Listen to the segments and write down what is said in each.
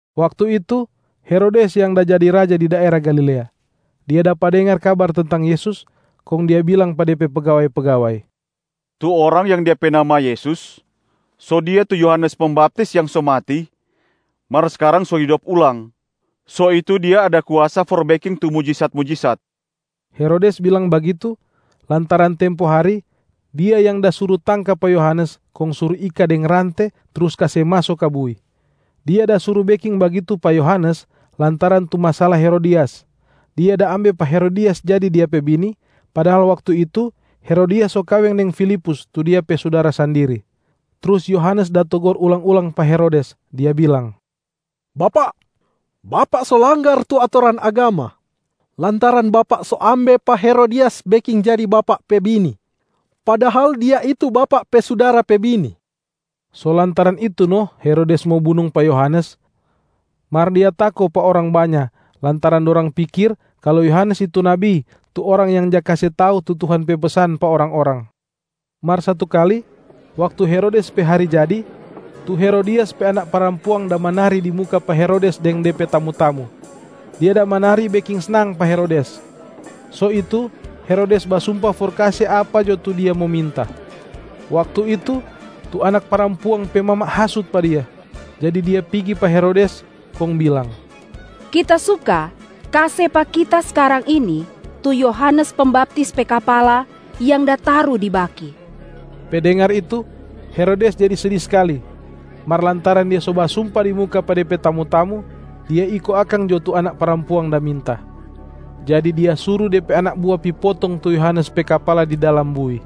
Waktu itu, Herodes yang da jadi raja di daera Galilea. Dia dapa dengar kabar tentang Yesus, kong dia bilang pa de pe pegawai-pegawai, “Tu Orang yang Dia pe nama Yesus, so Dia tu Yohanes Pembaptis yang so mati mar skarang so hidop ulang, so itu Dia ada kuasa for beking tu mujisat-mujisat.” Herodes bilang bagitu, lantaran tempo hari, dia yang da suru tangka pa Yohanes kong suru ika deng rante trus kase maso ka bui. Dia da suru beking bagitu pa Yohanes lantaran tu masala Herodias. Dia da ambe pa Herodias jadi dia pe bini, padahal waktu itu Herodias so kaweng deng Filipus tu dia pe sudara sandiri. Trus Yohanes da togor ulang-ulang pa Herodes, dia bilang, “Bapak, bapak so langgar tu atoran agama, lantaran bapak so ambe pa Herodias beking jadi bapak pe bini, padahal dia itu bapak pe sudara pe bini.” So lantaran itu no Herodes mo bunung pa Yohanes, mar dia tako pa orang banya lantaran dorang pikir kalu Yohanes itu nabi tu orang yang ja kase tau tu Tuhan pe pesan pa orang-orang. Mar satu kali, waktu Herodes pe hari jadi, tu Herodias pe anak parampuang da manari di muka pa Herodes deng de pe tamu-tamu. Dia da manari beking snang pa Herodes. So itu, Herodes basumpa for kase apa jo tu dia mo minta. Waktu itu, tu anak parampuang pe mama hasut pa dia. Jadi dia pigi pa Herodes kong bilang, “Kita suka kase pa kita skarang ini tu Yohanes Pembaptis pe kapala yang da taru di baki!” Pe dengar itu, Herodes jadi sedi skali. Mar lantaran dia so basumpa di muka pa de pe tamu-tamu, dia iyo akang jo tu anak parampuang da minta. Jadi dia suru de pe anak bua pi potong tu Yohanes pe kapala di dalam bui.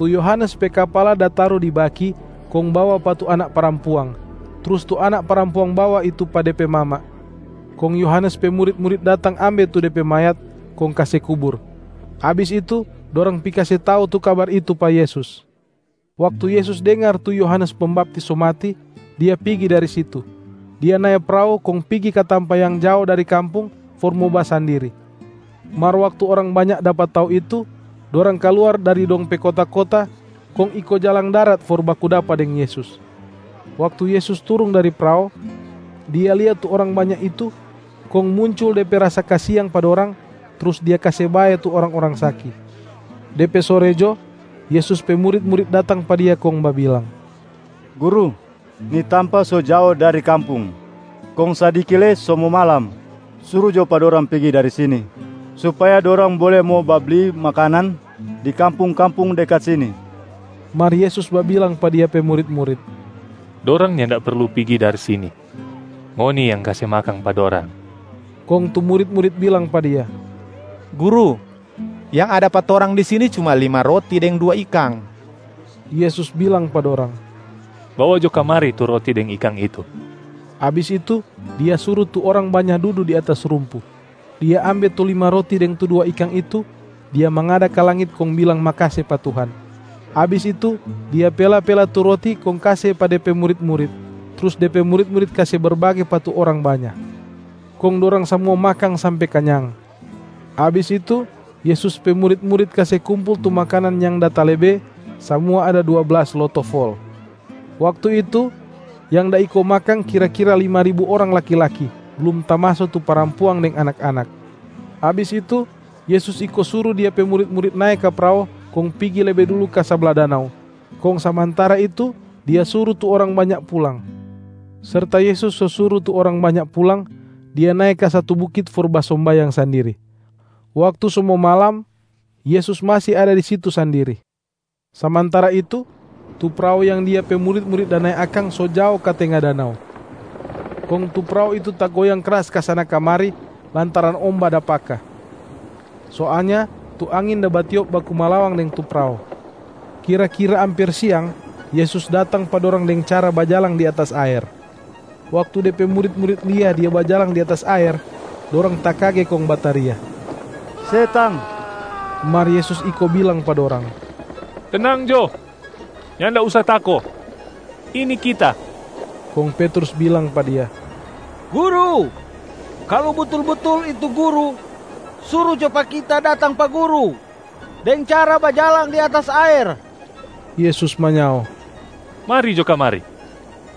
Tu Yohanes pe kapala da taru di baki kong bawa pa tu anak parampuang, trus tu anak parampuang bawa itu pa de pe mama. Kong Yohanes pe murit-murit datang ambe tu de pe mayat kong kase kubur. Abis itu, dorang pi kase tau tu kabar itu pa Yesus. Waktu Yesus dengar tu Yohanes Pembaptis so mati, Dia pigi dari situ. Dia nae prao kong pigi ka tampa yang jao dari kampung for mo basandiri. Mar waktu orang banya dapa tau itu, dorang kaluar dari dong pe kota-kota kong iko jalang darat for baku dapa deng Yesus. Waktu Yesus turung dari prao, Dia lia tu orang banya itu kong muncul De pe rasa kasiang pa dorang, trus Dia kase bae tu orang-orang saki. De pe sore jo, Yesus pe murit-murit datang pa Dia kong babilang, “Guru, ni tampa so jao dari kampung, kong sadiki lei so mo malam. Suru jo pa dorang pigi dari sini, supaya dorang bole mo babli makanan di kampung-kampung dekat sini.” Mar Yesus babilang pa Dia pe murit-murit, “Dorang nyanda perlu pigi dari sini, ngoni yang kase makang pa dorang.” Kong tu murit-murit bilang pa Dia, “Guru, yang ada pa torang di sini cuma lima roti deng dua ikang.” Yesus bilang pa dorang, “Bawa jo kamari tu roti deng ikang itu.” Abis itu Dia suru tu orang banya dudu di atas rumpu. Dia ambe tu lima roti deng tu dua ikang itu, Dia mangada ka langit kong bilang makase pa Tuhan. Abis itu Dia pela-pela tu roti kong kase pa De pe murit-murit, trus De pe murit-murit kase berbage pa tu orang banya. Kong dorang samua makang sampe kanyang. Abis itu, Yesus pe murit-murit kase kumpul tu makanan yang da talebe, samua ada dua blas loto fol. Waktu itu yang da iko makang kira-kira lima ribu orang laki-laki, blum tamaso tu parampuang deng anak-anak. Abis itu, Yesus iko suru Dia pe murit-murit nae ka prao kong pigi lebe dulu ka sabla danau, kong samantara itu Dia suru tu orang banya pulang. Serta Yesus so suru tu orang banya pulang, Dia nae ka satu bukit for basombayang sandiri. Waktu so mo malam, Yesus masi ada di situ sandiri. Samantara itu, tu prao yang Dia pe murit-murit da nae akang so jao ka tenga danau. Kong tu prao itu tagoyang kras kasana-kamari lantaran omba da paka. Soalnya tu angin da batiop baku malawang deng tu prao. Kira-kira amper siang, Yesus datang pa dorang deng cara bajalang di atas aer. Waktu De pe murit-murit lia Dia bajalang di atas aer, dorang takage kong bataria, “Setang!” Mar Yesus iko bilang pa dorang, “Tenang jo, nyanda usa tako! Ini Kita.” Kong Petrus bilang pa Dia, “Guru, kalu butul-butul itu Guru, suru jo pa kita datang pa Guru deng cara bajalang di atas aer.” Yesus manyao, “Mari jo kamari!”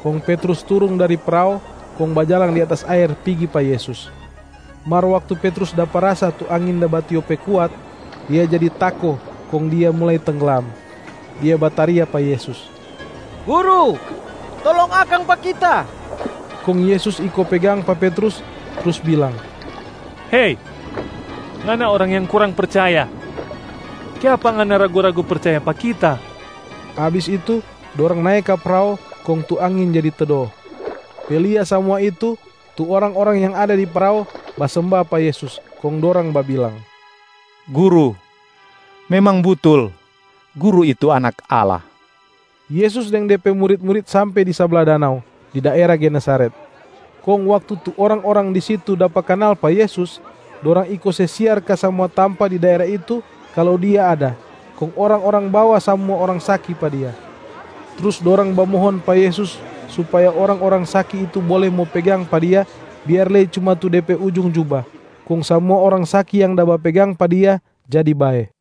Kong Petrus turung dari prao kong bajalang di atas aer pigi pa Yesus. Mar waktu Petrus dapa rasa tu angin da batiop pe kuat, dia jadi tako kong dia mulai tengglam. Dia bataria pa Yesus, “Guru, tolong akang pa kita!” Kong Yesus iko pegang pa Petrus, trus bilang, “Hei, ngana orang yang kurang percaya. Kiapa ngana ragu-ragu percaya pa Kita?” Abis itu dorang nae ka prao kong tu angin jadi tedo. Pe lia samua itu, tu orang-orang yang ada di prao basemba pa Yesus, kong dorang babilang, “Guru, memang butul Guru itu Anak Allah.” Yesus deng De pe murit-murit sampe di sabla danau, di daera Genesaret.a Kong waktu tu orang-orang di situ dapa kanal pa Yesus, dorang iko se siar ka samua tampa di daera itu kalu Dia ada, kong orang-orang bawa samua orang saki pa Dia. Trus dorang bamohon pa Yesus supaya tu orang-orang saki itu bole mo pegang pa Dia biar lei cuma tu De pe ujung juba, kong samua orang saki yang da bapegang pa Dia jadi bae.